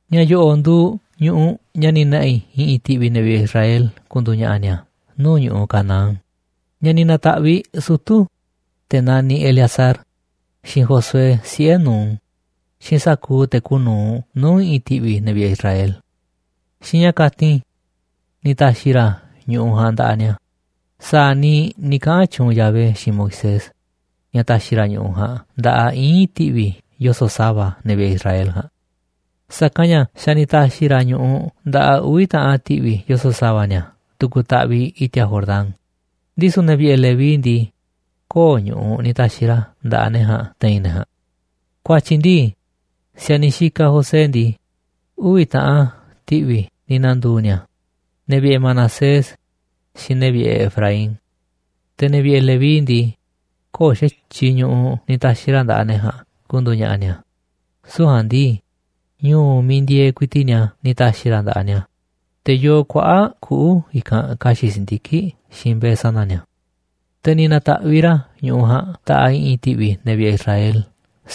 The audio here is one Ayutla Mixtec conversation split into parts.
Ña̱ yo̱ꞌo̱ꞌ nduuꞌ ñu̱ꞌuꞌ ña̱ ni̱ na̱ꞌi̱ i̱ꞌi̱n ti̱ꞌvi̱ ne̱ vi̱ꞌe̱ Israel ku̱ndu̱u̱ ña̱ꞌa̱ ni̱a̱ nuu̱ꞌ ñu̱ꞌuꞌ Canaán, ña̱ ni̱ na̱ta̱ꞌviꞌ sutu̱, te̱ naniꞌ Eleazar, xiinꞌ Josué, siꞌe̱ Nun, xiinꞌ sa̱kuuꞌ te̱ kuuꞌ nu̱uꞌ nuu̱ꞌ i̱ꞌi̱n ti̱ꞌvi̱ ne̱ vi̱ꞌe̱ Israel. Xiinꞌ ña̱ kati̱n ni̱ ta̱xi̱ ra̱ ñu̱ꞌuꞌ ja̱a̱nꞌ nda̱ꞌaꞌ ni̱a̱ sa̱a̱ niiꞌ ni̱ kaꞌa̱n tyuunꞌ Yahvé xiinꞌ Moisés, ña̱ ta̱xi̱ ra̱ ñu̱ꞌuꞌ ja̱a̱nꞌ nda̱ꞌaꞌ íin ti̱vi̱ yoso̱ꞌ sa̱va̱ ne̱ vi̱ꞌe̱ Israel ja̱a̱nꞌ. Sa̱kanꞌ ña̱ xa̱ ni̱ ta̱xi̱ ra̱ ñu̱ꞌuꞌ nda̱ꞌaꞌ uvi̱ taꞌan ti̱ꞌvi̱ yoso̱ꞌ sa̱va̱ ni̱a̱ tu̱ku̱ taꞌviꞌ i̱ti̱a̱ Jordán, ndisu̱ ne̱ vi̱ꞌe̱ Leví ndii, köo̱ꞌ ñu̱ꞌuꞌ ni̱ ta̱xi̱ ra̱ nda̱ꞌaꞌ ne̱ ja̱a̱nꞌ te̱i̱n ne̱ ja̱a̱nꞌ. Ku̱a̱tyi̱ ndii, si̱a̱niꞌ xikaꞌ José ndii, uvi̱ taꞌan ti̱ꞌvi̱ ni̱ na̱ndu̱u̱ ni̱a̱, ne̱ vi̱ꞌe̱ Manasés xiinꞌ ne̱ vi̱ꞌe̱ Efraín. Te̱ ne̱ vi̱ꞌe̱ Leví ndii, köo̱ꞌ xa̱tyiꞌ ñu̱ꞌuꞌ ni̱ ta̱xi̱ ra̱ nda̱ꞌaꞌ ne̱ ja̱a̱nꞌ ku̱ndu̱u̱ ña̱ꞌa̱ ni̱a̱, süu̱ꞌ ja̱a̱nꞌ ndii, ñu̱u̱ miiꞌ ku̱ndi̱e̱e̱ ku̱i̱ti̱ꞌ ni̱a̱ ni̱ ta̱xi̱ ra̱ nda̱ꞌaꞌ ni̱a̱, te̱ yoo kuaꞌa̱ꞌ kuꞌu̱ i̱kanꞌ ka̱xi̱ꞌ si̱ndiki̱ꞌ xiinꞌ mbe̱e̱ sana̱ ni̱a̱. Te̱ ni̱ na̱ta̱ꞌviꞌ ra̱ ñu̱ꞌuꞌ ja̱a̱nꞌ nda̱ꞌaꞌ i̱ꞌi̱n ti̱ꞌvi̱ ne̱ vi̱ꞌe̱ Israel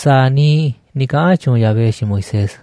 sa̱a̱ niiꞌ ni̱ kaꞌa̱n tyuunꞌ Yahvé xiinꞌ Moisés.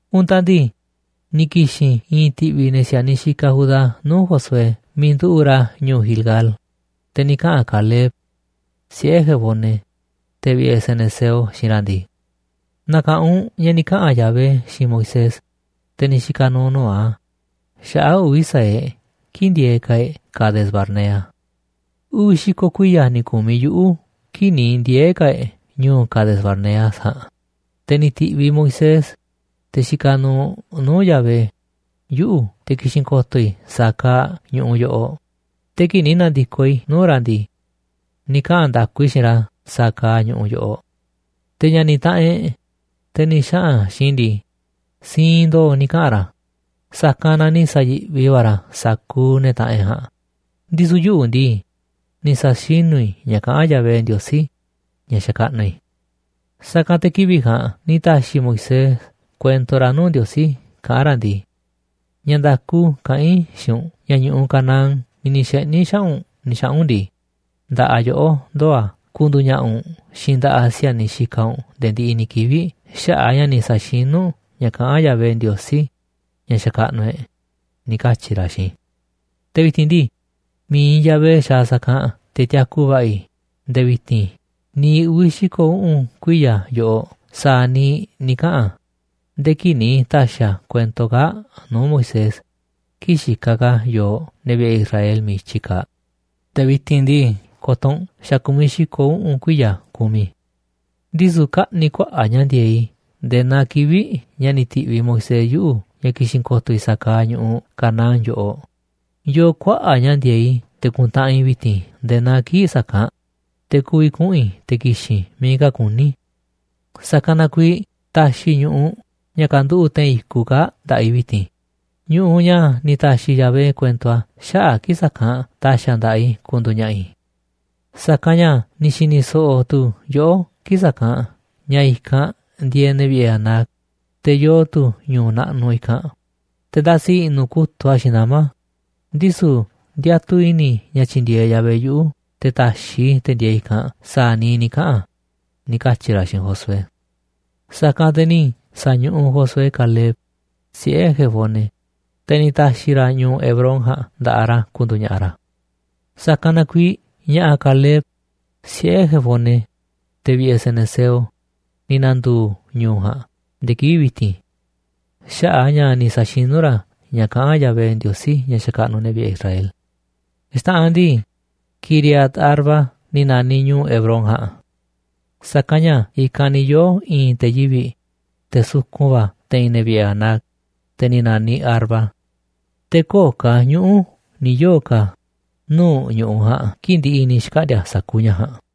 Untaꞌ ndii, ni̱ ki̱xi̱n i̱i̱n ti̱ꞌvi̱ ne̱ si̱a̱niꞌ xikaꞌ Judá nuu̱ꞌ Josué miiꞌ nduꞌu̱ꞌ ra̱ ñu̱u̱ Gilgal, te̱ ni̱ kaꞌa̱n Caleb, siꞌe̱ Jefone, te̱ vi̱ꞌe̱ cenezeo, xiinꞌ ra̱ ndii: ―Na̱ka̱ꞌanꞌ u̱nꞌ ña̱ ni̱ kaꞌa̱n Yahvé xiinꞌ Moisés, te̱ ni̱ xika̱ nu̱u̱ nuu̱ꞌ a̱, xaꞌa̱ꞌ uvi̱ sa̱aꞌ e̱ꞌ kii̱ꞌ ndieeꞌ ka̱ e̱ꞌ Cades-barnea. Uvi̱ xi̱ko̱ kuiya̱ ni̱ ku̱miꞌ yuꞌu̱ kii̱ꞌ ni̱ ndiee̱ ka̱ e̱ꞌ ñu̱u̱ Cades-barnea ja̱a̱nꞌ, te̱ ni̱ ti̱ꞌviꞌ Moisés, te̱ xikaꞌ nu̱u̱ nuu̱ꞌ Yahvé, yuꞌu̱ te̱ ki̱xi̱n ko̱to̱ i̱ sa̱a̱ kaaꞌ ñu̱ꞌuꞌ yoꞌoꞌ, te̱ kii̱ꞌ ni̱ na̱ndi̱koꞌ i̱ nuu̱ꞌ ra̱ ndii, ni̱ kaꞌa̱n nda̱ku i̱ xiinꞌ ra̱ sa̱a̱ kaaꞌ ñu̱ꞌuꞌ yoꞌoꞌ. Te̱ ña̱ni̱ taꞌanꞌ e̱ꞌ, te̱ ni̱ xaꞌa̱n xiinꞌ i̱ ndii, siinꞌ ndo̱o̱ ni̱ kaꞌa̱n ra̱, sa̱kanꞌ na ni̱ sa̱yi̱ꞌvi va̱ ra̱ sa̱kuuꞌ ne̱ taꞌanꞌ e̱ꞌ ja̱a̱nꞌ, ndisu̱ yuꞌu̱ ndii, ni̱ sa̱xinu̱ i̱ ña̱ kaꞌán Yahvé, Ndiosí ña̱ xakaꞌnuꞌ i̱. Sa̱kanꞌ te̱ kivi̱ꞌ ja̱a̱nꞌ ni̱ ta̱xi̱ Moisés kuento ra̱ nuu̱ꞌ Ndiosí kaꞌán ra̱ ndii: “Ña̱ nda̱ku kaꞌán i̱ xiinꞌ u̱nꞌ ña̱ ñu̱ꞌuꞌ Canaán miiꞌ ni̱ xeꞌni̱ xaꞌa̱ꞌ u̱nꞌ ni̱ xaꞌa̱n u̱nꞌ ndii, nda̱ꞌaꞌ yoꞌó ndoo̱ a̱ ku̱ndu̱u̱ ña̱ꞌa̱ u̱nꞌ xiinꞌ nda̱ꞌaꞌ si̱a̱niꞌ xikaꞌ u̱nꞌ nde̱e̱ ndiꞌiꞌ ni̱ kivi̱ꞌ xaꞌa̱ꞌ a̱ ña̱ ni̱ sa̱xinu̱ u̱nꞌ ña̱ kaꞌán Yahvé, Ndiosí ña̱ xakaꞌnuꞌ e̱ꞌ,” ni̱ katyi̱ ra̱ xiinꞌ i̱. ’Te̱ vi̱ti̱n ndii, mi̱iꞌ Yahvé xaaꞌ sa̱kanꞌ te̱ tiaku va̱ꞌa̱ i̱ nde̱e̱ vi̱ti̱n niiꞌ uvi̱ xi̱ko̱ uꞌu̱n kuiya̱ yoꞌoꞌ sa̱a̱ niiꞌ ni̱ kaꞌa̱n a̱, nde̱e̱ kii̱ꞌ ni̱ ta̱xi̱ a̱ kuento kaa̱ꞌ nuu̱ꞌ Moisés kii̱ꞌ xikaꞌ ka̱ yooꞌ, ne̱ vi̱ꞌe̱ Israel, miiꞌ i̱tyi kaaꞌ. Te̱ vi̱ti̱n ndii, ko̱to̱ u̱nꞌ xa̱ ku̱miꞌ xi̱ko̱ uꞌu̱n kuiya̱ kumiꞌ i̱. Ndisu̱ kaꞌni̱ kuaꞌa̱ꞌ ña̱ ndi̱e̱eꞌ i̱ nde̱e̱ naa kivi̱ꞌ ña̱ ni̱ ti̱ꞌviꞌ Moisés yuꞌu̱ ña̱ ki̱xi̱n ko̱to̱ i̱ sa̱a̱ kaaꞌ ñu̱ꞌuꞌ Canaán yoꞌoꞌ, yoo kuaꞌa̱ꞌ ña̱ ndi̱e̱eꞌ i̱ te̱ ku̱ntaꞌanꞌ i̱ vi̱ti̱n nde̱e̱ naa kii̱ꞌ sa̱kanꞌ, te̱ ku̱vi̱ kuꞌu̱n i̱ te̱ ki̱xi̱n i̱ miiꞌ ka̱ kuní i̱. Sa̱kanꞌ na kuiiꞌ ta̱xi̱ ñu̱ꞌuꞌ ña̱ kanduꞌu̱ꞌ te̱i̱n i̱kuꞌ kaa̱ꞌ nda̱ꞌaꞌ i̱ vi̱ti̱n, ñu̱ꞌuꞌ ña̱ ni̱ ta̱xi̱ Yahvé kuento a̱ xaꞌa̱ꞌ kii̱ꞌ sa̱kanꞌ ta̱xi̱ a̱ nda̱ꞌaꞌ i̱ ku̱ndu̱u̱ ña̱ꞌa̱ i̱. Sa̱kanꞌ ña̱ ni̱ xi̱ni̱ so̱ꞌo̱ tu̱ yoꞌó kii̱ꞌ sa̱kanꞌ ña̱ i̱kanꞌ ndieeꞌ ne̱ vi̱ꞌe̱ Anac, te̱ yoo tu̱ ñu̱u̱ naꞌnuꞌ i̱kanꞌ, te̱ ndasi i̱ꞌnu̱ kutu̱ꞌ a̱ xiinꞌ nama̱. Ndisu̱ ndiatuꞌ i̱ni̱ i̱ ña̱ tyi̱ndi̱e̱eꞌ Yahvé yuꞌu̱ te̱ ta̱xiꞌ i̱ te̱ ndieeꞌ i̱kanꞌ sa̱a̱ niiꞌ ni̱ kaꞌa̱n a̱ ―ni̱ katyi̱ ra̱ xiinꞌ Josué. Sa̱kanꞌ te̱ ni̱ sa̱ñuꞌuꞌ Josué Caleb, siꞌe̱ Jefone, te̱ ni̱ ta̱xi̱ ra̱ ñu̱u̱ Hebrón ja̱a̱nꞌ nda̱ꞌaꞌ ra̱ ku̱ndu̱u̱ ña̱ꞌa̱ ra̱. Sa̱kanꞌ na kuiiꞌ ña̱ꞌa̱ Caleb, siꞌe̱ Jefone, te̱ vi̱ꞌe̱ cenezeo, ni̱ na̱ndu̱u̱ ñu̱u̱ ja̱a̱nꞌ nde̱e̱ kivi̱ꞌ vi̱ti̱n xaꞌa̱ꞌ a̱ ña̱ ni̱ sa̱xinu̱ ra̱ ña̱ kaꞌán Yahvé, Ndiosí ña̱ xakaꞌnuꞌ ne̱ vi̱ꞌe̱ Israel. Xta̱ꞌanꞌ ndii, Quiriat-arba ni̱ na̱niꞌ ñu̱u̱ Hebrón ja̱a̱nꞌ. Sa̱kanꞌ ña̱ i̱kanꞌ ni̱ yoo̱ i̱i̱n te̱ yivi̱ꞌ, te̱ sukun va̱ te̱i̱n ne̱ vi̱ꞌe̱ Anac, te̱ ni̱ na̱niꞌ Arba. Te̱ köo̱ꞌ ka̱ ñuꞌu̱ ni̱ yoo̱ ka̱ nuu̱ꞌ ñu̱ꞌuꞌ ja̱a̱nꞌ kii̱ꞌ ndi̱ꞌi̱ ni̱ xkaꞌndi̱a̱ sa̱kuuꞌ ña̱ ja̱a̱nꞌ.